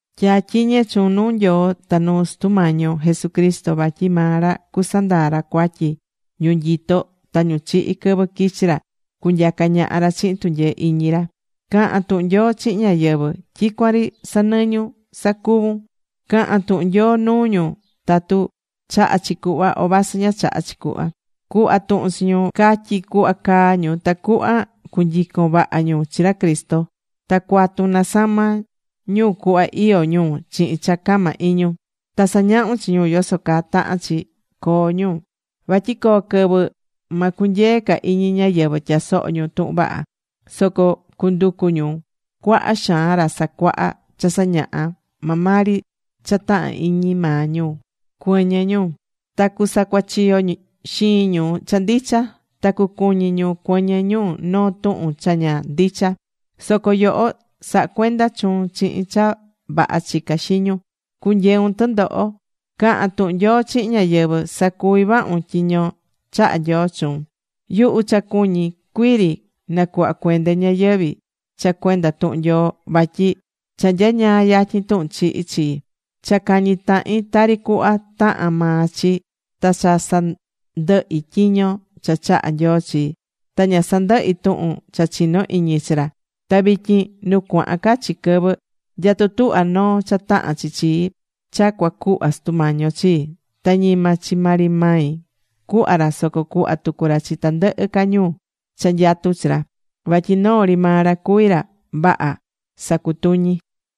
Tya̱tyiñe chuun nuu Nyoo ta nuu Sutu Mañi yo Jesucristo, vatyi maa ra cusandaa ra cuatyi ñu nyitó ta ñu chihi̱ quɨvɨ quichi ra cunyaca ñaha ra chihin tunyee iñi ra. Ca̱han tuhun Nyoo chihin ñáyɨvɨ. Tyicuan ri sa̱nɨñun sacuvun. Ca̱han tuhun Nyoo nuu ñu tatu chahá chi cuhva o vasɨ ña chahá chi cuhva. Cu̱hva tuhun chi ñu, ca̱tyi cuhva caa ñu tacuhva cunyicon vaha ñu chi ra Cristo. Ta cua̱tun nasama ñu cuhva iyó ñu chihin cha cama iñun. Ta sa̱ñahun chi ñu yoso caa tahán chi coo ñu. Vatyi coo quɨvɨ ma cunyee ca iñi ñáyɨvɨ tyasoho ñu tuhun vaha. Soco cunducu ñu cuaha xaan ra sacuaha cha sañahá maa maa ri cha tahan iñi maa ñu cuɨñɨ ñu. Ta cusacuachiyo xiin ñu cha ndicha. Ta cucuñi ñu cuɨñɨ ñu noo tuhun cha ña ndicha. Soco yoho sa̱ha cuenda chuun chihin cha vaha chica xiñun. Cu̱nyeun tɨndoho. Ca̱han tuhun Nyoo chihin ñáyɨvɨ. Sa̱cuvi vahun tyiño chaha̱ Nyoo chuun. Yuhu cha cuñí cuii ri nacuhva cuende ñayɨvi̱ cha cuenda tuhun Nyoo, vatyi cha nyañaa yatyin tuhun chihi chii. Cha cañi̱ tahin tari cuhva tahán maa chi ta cha sandɨhi̱ tyiño cha chaha̱ Nyoo chii. Ta ña sandɨhi̱ tuhun cha chinó iñi chi ra. Ta vityin nu cuahan ca chi quɨvɨ, nyatú tuhva noo cha tahán chi chii cha cuacuhva Sutu Mañi yo chii. Ta ñima chi maa ri mai cuhva ra, soco cuhva tucu ra chi tandɨhɨ ca ñu cha nyatú chi ra. Vatyi noo ri maa ra cuví ra vaha sacutuñí.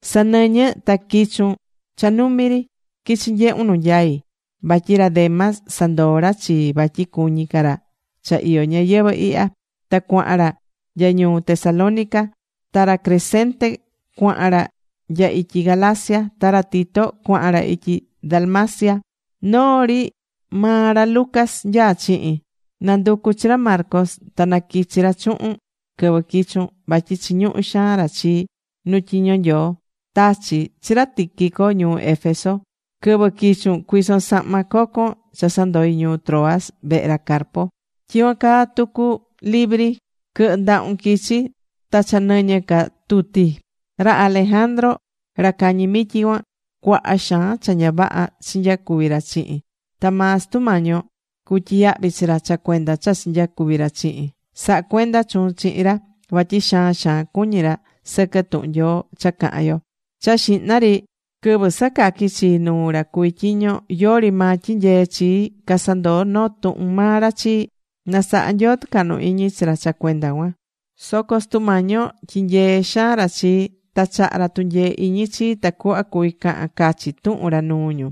Sa̱nɨñɨ ta qui̱chun cha numi ri, qui̱chi nyehun nu nyai. Vatyi ra Demas sandoo̱ ra chii vatyi cuñí ca ra cha iyó ñayɨvɨ̱ ihya. Ta cuahan ra nya ñuu Tesalónica. Ta ra Crescente cuahan ra nya ityi Galacia. Ta ra Tito cuahan ra ityi Dalmacia. Noo ri maa ra Lucas nyaá chihin. Na̱nducu chi ra Marcos ta na quichi ra chuhun quɨvɨ quichun. Vatyi chiñuhú xaan ra chii nu tyiño Nyoo. Tachi̱ chi ra Tíquico ñuu Éfeso. Quɨvɨ quichun cui̱son sahma cocon cha sandoi̱ ñuu Troas vehe ra Carpo. Tyicuan caa tucu libri, quɨ̱hɨ ndahun quichi. Ta cha nɨñɨ ca tuti. Ra Alejandro ra cañi mityi cuan, cuaha xaan cha ña vaha chinyacuvi̱ ra chihin. Ta maa Sutu Mañi yo cutyiyahvi chi ra cha cuenda cha chinyacuvi̱ ra chihin. Sa̱ha cuenda chuun chihin ra. Vatyi xaan xaan cuñí ra sɨquɨ tuhun Nyoo cha cahán yo. Cha xihna ri quɨvɨ sacaqui̱ chii nuu ra cuví tyiño, yori maa tyinyee̱ chii. Casandoo̱ noo tuhun maa ra chii. Na saha Nyoo tɨcahnu iñi chi ra cha cuenda cuan. Soco Sutu Mañi yo tyinyee̱ xaan ra chii. Ta chaha̱ ra tunyee iñi chii tacuhva cuvi̱ cahan cachi tuhun ra nuu ñu,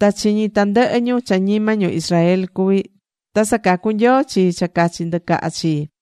ta chiñi̱ tandɨhɨ ñu cha ñima ñu Israel cuví. Ta sacacu̱ Nyoo chii cha cachi ndɨcaha chii.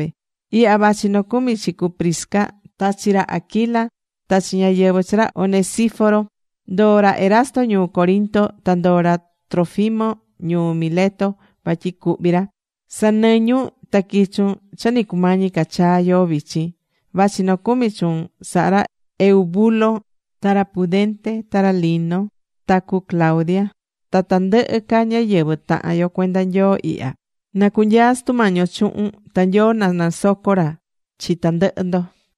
Ihya vachi nocumi chi cu Prisca ta chi ra Aquila ta chi ñáyɨvɨ chi ra Onesíforo. Ndoo̱ ra Erasto ñuu Corinto. Ta ndoo̱ ra Trófimo ñuu Mileto vatyi cuhví ra. Sa̱nɨñun ta qui̱chun cha nɨ cumañi ca chaa yoo vichin. Vachi nocumi chuun sahá ra Eubulo ta ra Pudente ta ra Lino ta cu Claudia ta tandɨhɨ ca ñáyɨvɨ tahan yo cuenda Nyoo ihya. Na cunyaa Sutu Mañi yo chuhun. Ta Nyoo na nasoco ra chi tandɨhɨ ndo.